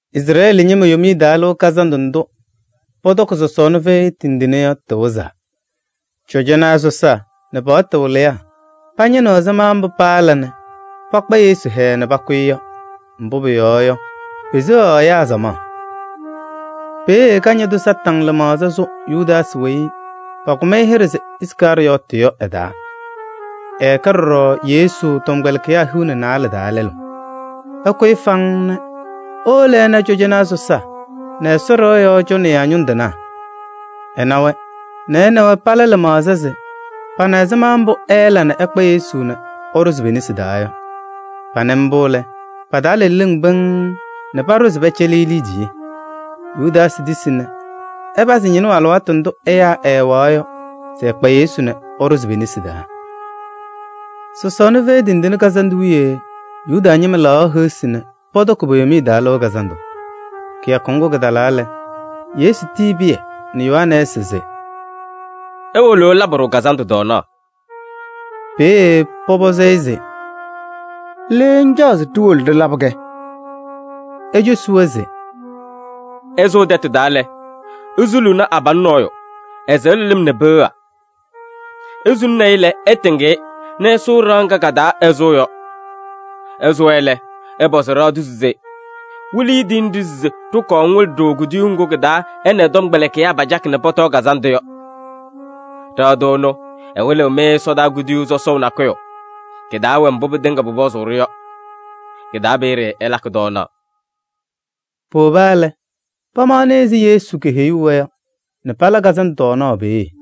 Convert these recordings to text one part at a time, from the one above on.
Izrɛɛlɩ ñɩma Yomiye Taa Lɩʋ Kazandʋ ndʋ pɔtɔkɩ sɔsɔɔna fɛyɩ tindine yɔ, kɩwɩzaa. Cɔjɔnaa sɔsaa nɛ paɣtʋ wɩlɩyaa pañɩnɩ ɛzɩma mbʋ paala nɛ pakpa Yesu hɛɛɛ nɛ pakʋ-ɩ yɔ. Mbʋ pʋyɔɔ yɔ, peseɣaɣ ɛyaa samaɣ. Peeye Kañadʋ Satanɩ lɩmaɣza sʋ Yudaasɩ weyi pakʋm-ɩ hɩɖɛ se Iskarɩyɔɔtɩ yɔ ɛ-taa. Ɛkɛ ɖɔɖɔ Yesu tɔmkpɛlɩkɩyaa hiu nɛ naalɛ taa lɛlʋ. Ɛkʋyɩ faŋŋ nɛ ewolo ɛna cɔjɔnaa sɔsaa nɛ Ɛsɔ ɖɩɣa yɔɔ cɔnɩyaa ñʋŋ tɩnaa. Ɛna-wɛ nɛ ɛ nɛ wɛ pala lɩmaɣza se pana ɛzɩma mbʋ ɛɛla nɛ ɛkpa Yesu nɛ ɛɖʋzɩ pe-nesi taa yɔ. Panɩ mbʋ lɛ, pa-taa la leleŋ pɩŋŋ nɛ paɖʋ se pɛcɛlɩɣ-ɩ liidiye. Yudaasɩ tisi nɛ ɛpazɩ ñɩnʋʋ alɩwaatʋ ndʋ ɛyaa ɛɛwɛɣ yɔ se ɛkpa Yesu nɛ ɛɖʋzɩ pe-nesi taa. Sɔsɔɔna Fɛyɩ Tindine Kazandʋ wiye Yuda ñɩma laɣaɣ heɣsi nɛ pɔtɔkɩ po-Yomiye Taa Lɩʋ Kazandʋ. Kɩyakʋ ŋgʋ kɩtalaa lɛ, Yesu tiyi Pɩyɛ nɛ Yohanɛɛsɩ se: “Iwolo ɩlabɩ-ɖʋ kazandʋ tɔɔnaɣ.” Peeye pɔpɔzɩ-ɩ se: “Le ŋcaɣ se ɖiwolo ɖɩlabɩ-kɛ?” Ecosi-wɛ se: “Ɩsʋʋ tɛtʋ taa lɛ, isuluuni abalʋ nɔɔyʋ, ɛsɩɣlɩ lɩm nɛ peɣa. Isuluni-i lɛ, ɩtɩŋ-ɩ nɛ ɩsʋʋ ɖɩɣa ŋga ka-taa ɛsʋʋ yɔ. Ɩsʋwa lɛ, ɩpɔzɩ ɖɩɣa tʋ se: ‘Wɩlɩyʋ tiyini-ɖʋ se ɖɩkɔɔ ŋwɩlɩ-ɖʋ kuduyuu ŋgʋ kɩ-taa ɛ nɛ ɛ-tɔmkpɛlɩkɩyaa pacakɩ nɛ pɔtɔɔ kazandʋ yɔ.’ Ɖɩɣa tʋ ɛnʋ, ɛwɩlɩɣ-mɩ ɛsɔdaa kuduyuu sɔsɔʋ nakʋyʋ. Kɩ-taa wɛ mbʋ pɩtɩŋa pʋpɔzʋʋ-ɖʋ yɔ. Kɩ-taa peeye ɩlakɩ tɔɔnaɣ.” Powoba lɛ, pamaɣnɩ ɛzɩ Yesu keheyuu-wɛ yɔ nɛ pala kazandʋ tɔɔnaɣ peeye.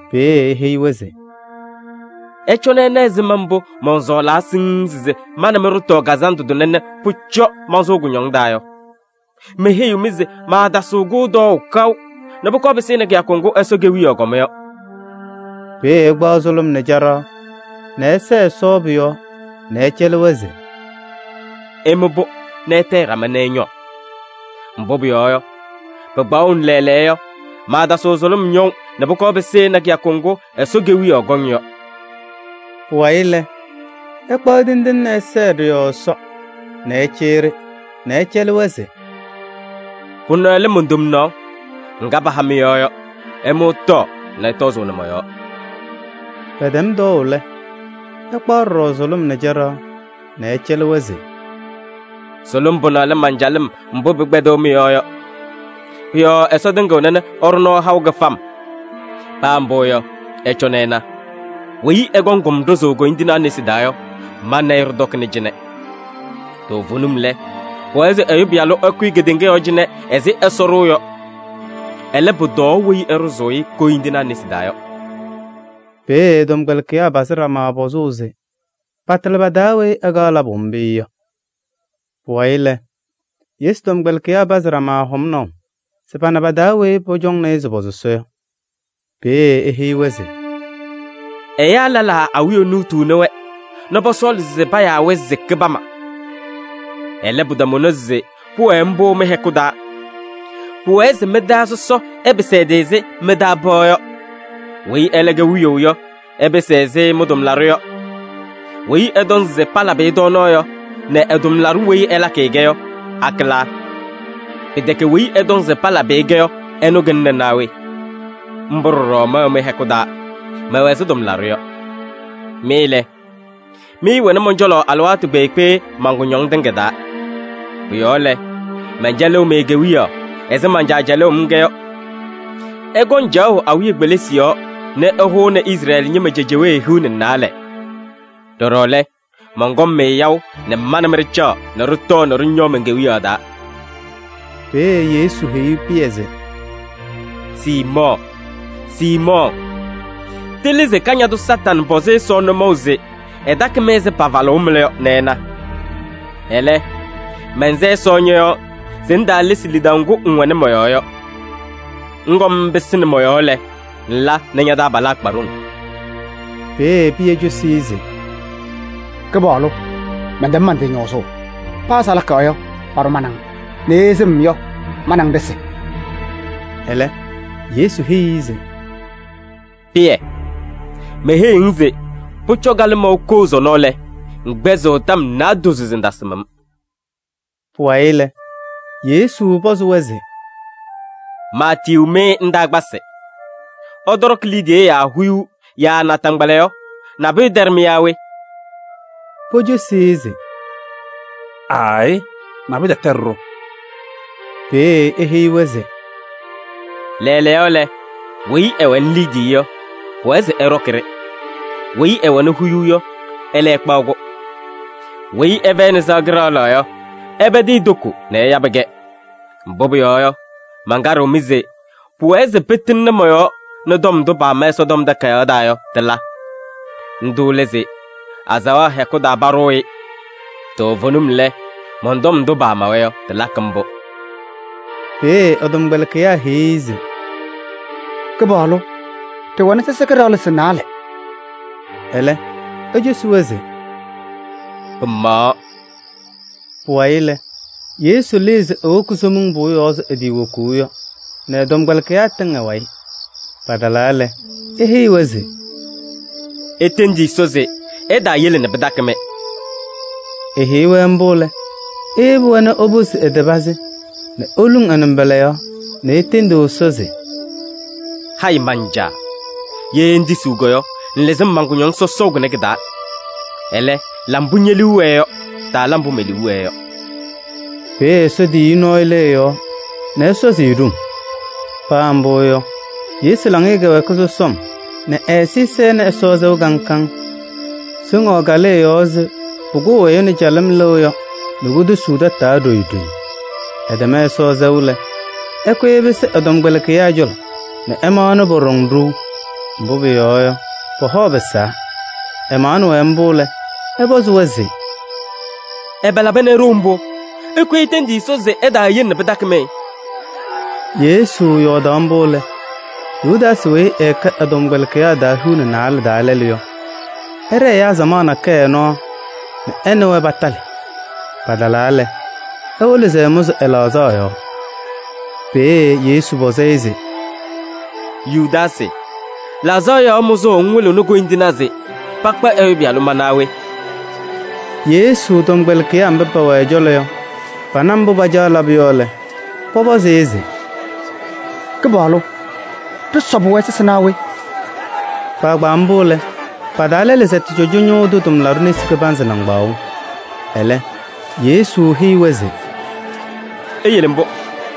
Peeye eheyi-wɛ se: “Ɩcɔnɩ ɩna ɛzɩma mbʋ mɔnsɔɔlaa siŋŋ se ma nɛ mɩ ɖɩtɔɔ kazandʋ tʋnɛ nɛ pʋcɔ mansʋʋ kʋñɔŋ taa yɔ! Meheyiɣ-mɩ se maatasɩɣ-kʋ tɔɔʋ kaʋ nɛ pʋkɔɔ pɩsɩnɩ kɩyakʋ ŋgʋ Ɛsɔ Kewiyaɣ kɔma yɔ.” Peeye ɛkpaɣ sʋlʋm nɛ caɖaɣ nɛ ɛsɛɛ pʋ-yɔɔ Ɛsɔ nɛ ɛcɛlɩ-wɛ se: “Ɩmʋ-pʋ nɛ ɩtayɩ ɖama nɛ ɩñɔɔ.” Mbʋ pʋyɔɔ yɔ, pɩkpaɣʋnɩ lɛɛlɛɛyɔ yɔ, maatasɩɣ sʋlʋm ñɔʋ nɛ pʋkɔɔ pɩsɩnɩ kɩyakʋ ŋgʋ Ɛsɔ Kewiyaɣ kɔŋ yɔ. Pʋwayɩ lɛ, ɛkpaɣ tindine nɛ ɛsɛɛ ɖɩ-yɔɔ Ɛsɔ nɛ ɛcɩyɩ-ɖɩ nɛ ɛcɛlɩ-wɛ se: “Pʋnɛ lɛ mon-tomnaɣ [ŋga paha mɩ-yɔɔ yɔ. Ɩmʋ ɩtɔɔ nɛ ɩtɔzʋʋnɩ mɔ-yɔɔ.” Pɛtɛm tɔɔʋ lɛ, ɛkpaɣ ɖɔɖɔ sʋlʋm nɛ caɖaɣ nɛ ɛcɛlɩ-wɛ se: “Sʋlʋm pʋnɛ lɛ man-calɩm mbʋ pɩkpɛdɩɣ mɩ-yɔɔ yɔ. Pʋ-yɔɔ Ɛsɔ tɩŋɩɣna nɛ ɛɖʋ nɔɔ haʋ kɩfam.”] Paa mbʋ yɔ, ɩcɔnɩ ɩna: “Weyi ɛkɔŋ-m ɖʋzʋʋ koyindinaa nesi taa yɔ, ma nɛ ɩ ɖɩtɔkɩna cɩnɛ! Toovenim lɛ, pʋwɛɛ se Ɛyʋ Pɩyalʋ ɛkʋyɩ kedeŋa yɔɔ cɩnɛ ɛzɩ Ɛsɔ ɖʋʋ yɔ. Ɛlɛ, pʋtɔɔ weyi ɛɖʋzʋʋ-ɩ koyindinaa nesi taa yɔ!” Peeye ɛ-tɔmkpɛlɩkɩyaa pazɩ ɖama pɔzʋʋ se patɩlɩ pa-taa weyi ɛkaɣ labʋ mbʋ yɔ. Pʋwayɩ lɛ, Yesu tɔmkpɛlɩkɩyaa pazɩ ɖama hɔmnaʋ se pana pa-taa weyi pɔcɔŋnɩ se pɔ-sɔsɔ yɔ. Peeye eheyi-wɛ se: “Ɛyaa lɛlaa awiya nuutuuni-wɛ nɛ pɔsɔɔlɩ se payaa-wɛ se kɩbama. Ɛlɛ, pɩtamʋnɩ se pʋwɛɛ mbʋ mɩ-hɛkʋ taa. Pʋwɛɛ se mɩ-taa sɔsɔ ɛpɩsɩ ɛ-tɩ ɛzɩ mɩ-taa pɩɣa yɔ. Weyi ɛlɛ kɛ wiyaʋ yɔ, ɛpɩsɩ ɛzɩ mɩ-tʋmlaɖʋ yɔ. Weyi ɛtɔŋ se palabɩ-ɩ tɔɔnaɣ yɔ nɛ ɛ-tʋmlaɖʋ weyi ɛlakɩ-kɛ yɔ, akɩlaa? Pɩtɛkɛ weyi ɛtɔŋ se palabɩ-ɩ-kɛ yɔ, ɛnʋ kɩlɩna naa we? Mbʋ ɖɔɖɔ mɛwɛ mɩ-hɛkʋ taa, mɛwɛ ɛzɩ tʋmlaɖʋ yɔ. Mɩ lɛ, mɩɩwɛnɩ mɔn-cɔlɔ alɩwaatʋ kpeekpe man-kʋñɔmɩŋ tɩŋa taa. Pʋ-yɔɔ lɛ, mɛncɛlɩɣ-mɩ kewiyaɣ ɛzɩ man-Caa cɛlʋʋ-m-kɛ yɔ. Ɩkɔŋ caɣʋ awiya kpelisi yɔɔ nɛ ɩhʋʋnɩ Izrɛɛlɩ ñɩma cejewee hiu nɛ naalɛ. Ɖɔɖɔ lɛ, mɔnkɔŋ-mɩ yaʋ nɛ ma nɛ mɩ ɖɩcaɣ nɛ ɖɩtɔɔ nɛ ɖɩñɔɔ men-Kewiyaɣ taa.” Peeye Yesu heyi Pɩyɛ se: “Siimɔɔ! Siimɔɔ! Tɩlɩ se Kañadʋ Satanɩ pɔzɩ Ɛsɔ nʋmɔʋ se ɛtakɩ-mɩ ɛzɩ pafalʋʋ mɩla yɔ nɛ ɛna. Ɛlɛ, mɛnsɛ Ɛsɔ ñɔ-yɔɔ se ŋtaalesi lidaʋ ŋgʋ ŋwɛnɩ mɔ-yɔɔ yɔ. Ŋkɔm ŋpɩsɩnɩ mɔ-yɔɔ lɛ, ŋla nɛ ña-taabalaa kpa ɖoŋ.” Peeye Pɩyɛ cosi-i se: “Kɩpaɣlʋ! Mɛntɛm man-tɩ ñɔɔzʋʋ. Paa salaka yɔ, paɖʋ ma nɛ ŋ nɛ ye sɩm yɔ, ma nɛ ŋ ɖɩsɩ.” Ɛlɛ Yesu heyi-i se: “Pɩyɛ! Meheyiɣ-ŋ se: pʋcɔ kalɩmɔʋ koo sɔnɔ lɛ, ŋkpɛzɩɣ tɔm naadozo se ŋtasɩm-m.” Pʋwayɩ lɛ, Yesu pɔzɩ-wɛ se: “Maatiyuu-mɩ ndaakpasɩ, ɩtɔɖɔkɩ liidiye yaa huyuu yaa naataŋgbala yɔ, nabʋyʋ tɛɖɩ-mɩ yaa we?” Pocosi-i se: “Aayɩ, nabʋyʋ tɛtɛɖɩ-ɖʋ.” Peeye eheyi-wɛ se: “Lɛɛlɛɛyɔ lɛ, weyi ɛwɛnɩ liidiye yɔ, pʋwɛɛ se ɛɖɔkɩ-ɖɩ. Weyi ɛwɛnɩ huyuu yɔ, ɛlɛ ɛkpaɣ-kʋ. Weyi ɛfɛyɩnɩ sɩɣa kɩɖaɣlaɣ yɔ, ɛpɛdɩ e-toko nɛ ɛyabɩ-kɛ. Mbʋ pʋyɔɔ yɔ, mankaɖɩɣ-mɩ se pʋwɛɛ se pɩtɩŋnɩ mɔ-yɔɔ nɛ tɔm ndʋ paama Ɛsɔtɔm Takayaɣ taa yɔ, tɩla. Ndʋ lɛ se: ‘Azaɣa hɛkʋ taa paɖʋʋ-ɩ.’ Toovenim lɛ, mɔn-tɔm ndʋ paamawa yɔ, tɩlakɩ mbʋ.” Peeye ɛ-tɔmkpɛlɩkɩyaa heyi-i se: “Kɩpaɣlʋ! Ɖɩwɛnɩ sɛsɩ kɩɖaɣlɩsɩ naalɛ.” Ɛlɛ ecosi-wɛ se: “Pɩmaɣaɣ.” Pʋwayɩ lɛ, Yesu lɩɩ se ewoki Somiŋ Pʋʋ yɔɔ ɛzɩ etiiwokuu yɔ nɛ ɛ-tɔmkpɛlɩkɩyaa tɩŋ ɛ-wayɩ. Patalaa lɛ, eheyi-wɛ se: “Itendi Ɛsɔ se ɛtaayele nɛ pɩtakɩ-mɩ.” Eheyi-wɛ mbʋ lɛ, eyebi-wɛ nɛ eposi ɛ-tɩ pazɩ nɛ eluŋ ɛ-nɩmbɔla yɔɔ nɛ etendi Ɛsɔ se: “Hayɩ Man-Caa! Ye ŋtisiɣ yɔ, ŋlɩzɩ-m man-kʋñɔŋ sɔsɔʋ kʋnɛ kɩ-taa. Ɛlɛ, la mbʋ ñe-liu wɛɛ yɔ, taala mbʋ me-liu wɛɛ yɔ.” [ Peeye Ɛsɔ tiyiyu nɔɔyʋ lɩ ɛ-yɔɔ nɛ ɛsɔzɩ-ɩ ɖoŋ. Paa mbʋ yɔ, Yesu laŋɩyɛ kɛwɛɛkɩ sɔsɔm nɛ ɛ-ɛzɩyɛ sɛnɩ Ɛsɔ sɛʋ kaŋ kaŋ. Soŋaɣ kalɩ ɛ-yɔɔ ɛzɩ pʋkʋʋ ɛyʋ nɛ calɩm lɩɣ yɔ nɛ kotosuu tataa ɖoyi ɖoyi.] Ɛtɛm Ɛsɔ sɛʋ lɛ, ɛkʋyɩ ɛpɩsɩ ɛ-tɔmkpɛlɩkɩyaa cɔlɔ nɛ ɛmaɣnɩ pɔɖɔŋ ɖou, mbʋ pʋyɔɔ yɔ, pɔ-hɔ pɩsaa. Ɛmaɣnɩ-wɛ mbʋ lɛ, ɛpɔzɩ-wɛ se: “Ɛbɛ laba nɛ iɖou mbʋ? Ɩkʋyɩ itendi Ɛsɔ se ɛtaayele nɛ pɩtakɩ-mɩ.” Yesu yɔɔdaɣ mbʋ lɛ, Yudaasɩ weyi ɛkɛ ɛ-tɔmkpɛlɩkɩyaa hiu nɛ naalɛ taa lɛlʋ yɔ, ɛɖɛɛ ɛyaa samaɣ nakɛyɛ nɔɔ nɛ ɛ nɛ wɛ patalɩ. Patalaa lɛ, ewolo se ɛmʋzɩ ɛ-laɣzaɣ yɔɔ. Peeye Yesu pɔzɩ-ɩ se: “Yudaasɩ! Laɣzaɣ yɔɔ mʋzʋʋ ŋwɩlɩɣnɩ koyindinaa se pakpa Ɛyʋ Pɩyalʋ ma naa we?” Yesu tɔmkpɛlɩkɩyaa mba pɛwɛ ɛ-cɔlɔ yɔ, pana mbʋ pacaɣ labʋ yɔ lɛ, pɔpɔzɩ-ɩ se: “Kɩpaɣlʋ! Ɖɩsɔbɩ-wɛ sɛsɩ naa we?” Kpaagbaa mbʋ lɛ, pa-taa lɛlʋ sɛtɩ cɔjɔnaa ñʋʋ tʋ tʋmlaɖʋ nesi kɩbanzɩ nɩŋgbaŋʋʋ. Ɛlɛ Yesu heyi-wɛ se: “Iyele mbʋ,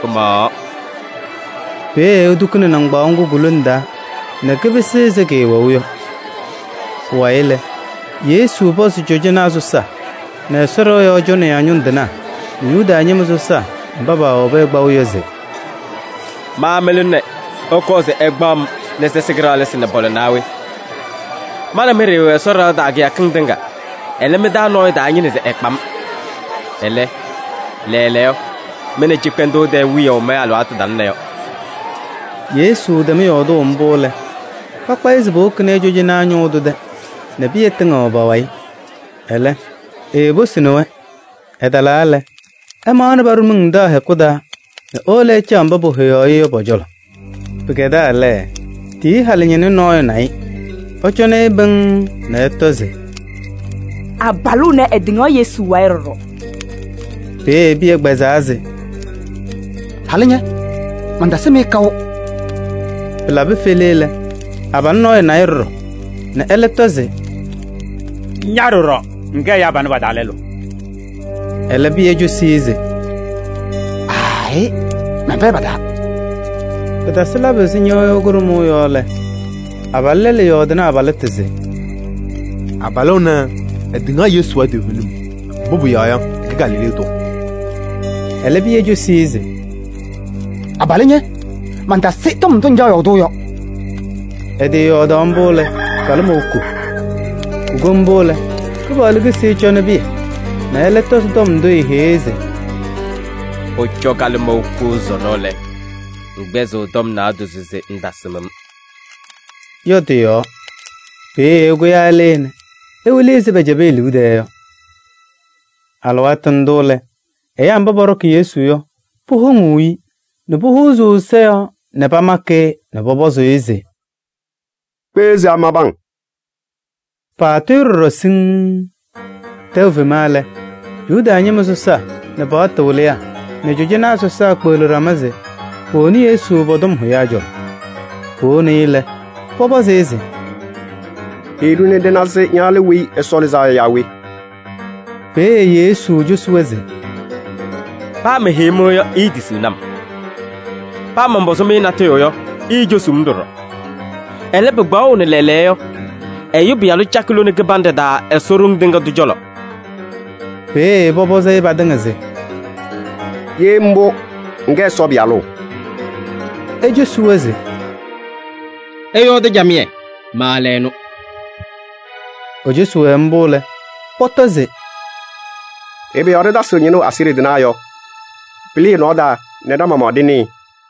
pɩmaɣaɣ.” Peeye etukuni nɩŋgbaŋʋʋ ŋgʋ ku-lone taa nɛ kɩpɩsɩ ɛzɩ kɩɩwɛʋ yɔ. Pʋwayɩ lɛ, Yesu pɔzɩ cɔjɔnaa sɔsaa nɛ Ɛsɔ ɖɩɣa yɔɔ cɔnɩyaa ñʋŋ tɩnaa nɛ Yuda ñɩma sɔsaa mba powobi-i kpaʋ yɔ se: “Ma mɩlʋ nɛ ɩkɔɔ se ɩkpaɣ-m nɛ sɛsɩ kɩɖaɣlɩsɩ nɛ pɔla naa we? Ma nɛ mɩ ɖɩɩwɛ Ɛsɔ ɖɩɣa taa kɩyakɩŋ tɩŋa, ɛlɛ mɩ-taa nɔɔyʋ taañɩnɩ se ɛkpa-m. Ɛlɛ, lɛɛlɛɛyɔ, mɩ nɛ cɩkpɛndʋʋ tɛɛ wiyaʋ mɩ-alɩwaatʋ talɩna yɔ.” Yesu tɛm yɔɔdʋʋ mbʋ lɛ, pakpa-ɩ se powokini-i cɔjɔnaa ñʋʋ tʋ tɛ nɛ Pɩyɛ tɩŋɩɣ pa-wayɩ, ɛlɛ, eeposini-wɛ. Ɛtalaa lɛ, ɛmaɣnɩ paɖʋ miŋ taɣ hɛkʋ taa nɛ ewolo ɛcaɣ mba pohoyaɣ-ɩ yɔ pɔ-cɔlɔ. Pɩkɛdaa lɛ, tiyiyu halʋ ñɩnʋ nɔɔyʋ na-ɩ nɛ ɛcɔnɩ-ɩ pɩŋŋ nɛ ɛtɔ se: “Abalʋ ɛnɛ, ɛtɩŋaɣ Yesu wayɩ ɖɔɖɔ!” Peeye Pɩyɛ kpɛzaa se: “Halʋ ña! Mantasɩm-ɩ kaʋ.” Pɩlabɩ fele lɛ, abalʋ nɔɔyʋ na-ɩ ɖɔɖɔ nɛ ɛlɛ tɔ se: “Ña ɖɔɖɔ, ŋkɛ ɛyaa panɛ pa-taa lɛlʋ.” Ɛlɛ, Pɩyɛ cosi-i se: “Aayɩ! Mɛnfɛyɩ pa-taa.” Pɩtasɩ labʋ ɛzɩ ñɩɣyʋʋ kʋɖʋmʋʋ yɔ lɛ, abalʋ lɛlʋ yɔɔdɩnɩ abalɩtʋ se: “Abalʋ ɛnɛ, ɛtɩŋaɣ Yesu wayɩ toovenim, mbʋ pʋyɔɔ yɔ, ɛkɛ Galilee tʋ.” Ɛlɛ Pɩyɛ cosi-i se: “Abalʋ ña! Mantasɩ tɔm ndʋ ŋcaɣ yɔɔdʋʋ yɔ. Ɛtɩyɔɔdaɣ mbʋ lɛ, kalɩmɔʋ koo.” Kuko mbʋ lɛ, Kɩpaɣlʋ kisi nɛ ɛcɔnɩ Pɩyɛ nɛ ɛlɛ tɔzɩ tɔm ndʋ eeheyi-i se: “Pʋcɔ kalɩmɔʋ koo sɔnɔ lɛ, ŋkpɛzɩɣ tɔm naadozo se ŋtasɩm-m” yɔ tɩ-yɔɔ. Peeye ɛkʋyaa ɛlɩɩ nɛ ewili ɛzɩ pɛcɛbɩ e-liu tɛɛ yɔ. Alɩwaatʋ ndʋ lɛ, ɛyaa mba pɔɖɔkɩ Yesu yɔ, powoŋuu-i nɛ pohuuzuu ɛ-ɛza yɔɔ nɛ pamakɩ-ɩ nɛ pɔpɔzʋʋ-ɩ se: “Kpeɣ se amabɩ-ŋ?” Paatʋ-ɩ ɖɔɖɔ siŋŋ. Tɛʋ fema lɛ, Yuda ñɩma sɔsaa nɛ pa-paɣtʋ wɩlɩyaa nɛ cɔjɔnaa sɔsaa pekpeɣli ɖama se powoni Yesu pɔ-tɔm hʋyaa cɔlɔ. Powoni-i lɛ, pɔpɔzɩ-ɩ se: “Heyi-ɖʋ nɛ ɖɩna se ña lɛ Weyi Ɛsɔ Lɩzaa Yɔ yaa we?” Peeye Yesu cosi-wɛ se: “Paa meheyi-mɩ yɔ, iitisiɣni-m. Paa mɔnpɔzɩ-mɩ natʋyʋ yɔ, iicosuu-m ɖɔɖɔ. Ɛlɛ, pɩkpaɣʋnɩ lɛɛlɛɛyɔ yɔ, Ɛyʋ Pɩyalʋ cakɩ lone kɩbanɖɛ taa Ɛsɔ Ɖoŋ Tɩŋa Tʋ cɔlɔ.” Peeye pɔpɔzɩ-ɩ patɩŋa se: “Ye mbʋ, ŋkɛ Ɛsɔ Pɩyalʋ?” Ecosi-wɛ se: “Ɩyɔɔdɩ camɩyɛ, ma lɛ ɛnʋ.” Ecosi-wɛ mbʋ lɛ, pɔtɔ se: “Ɛbɛ yɔɔ ɖɩtasɩɣ ñɩnʋʋ aseɣɖe tɩnaa yɔ? Pɩlɩ ɛ-nɔɔ taa nɛ ɖa-maɣmaɣ ɖɩnɩɩ.”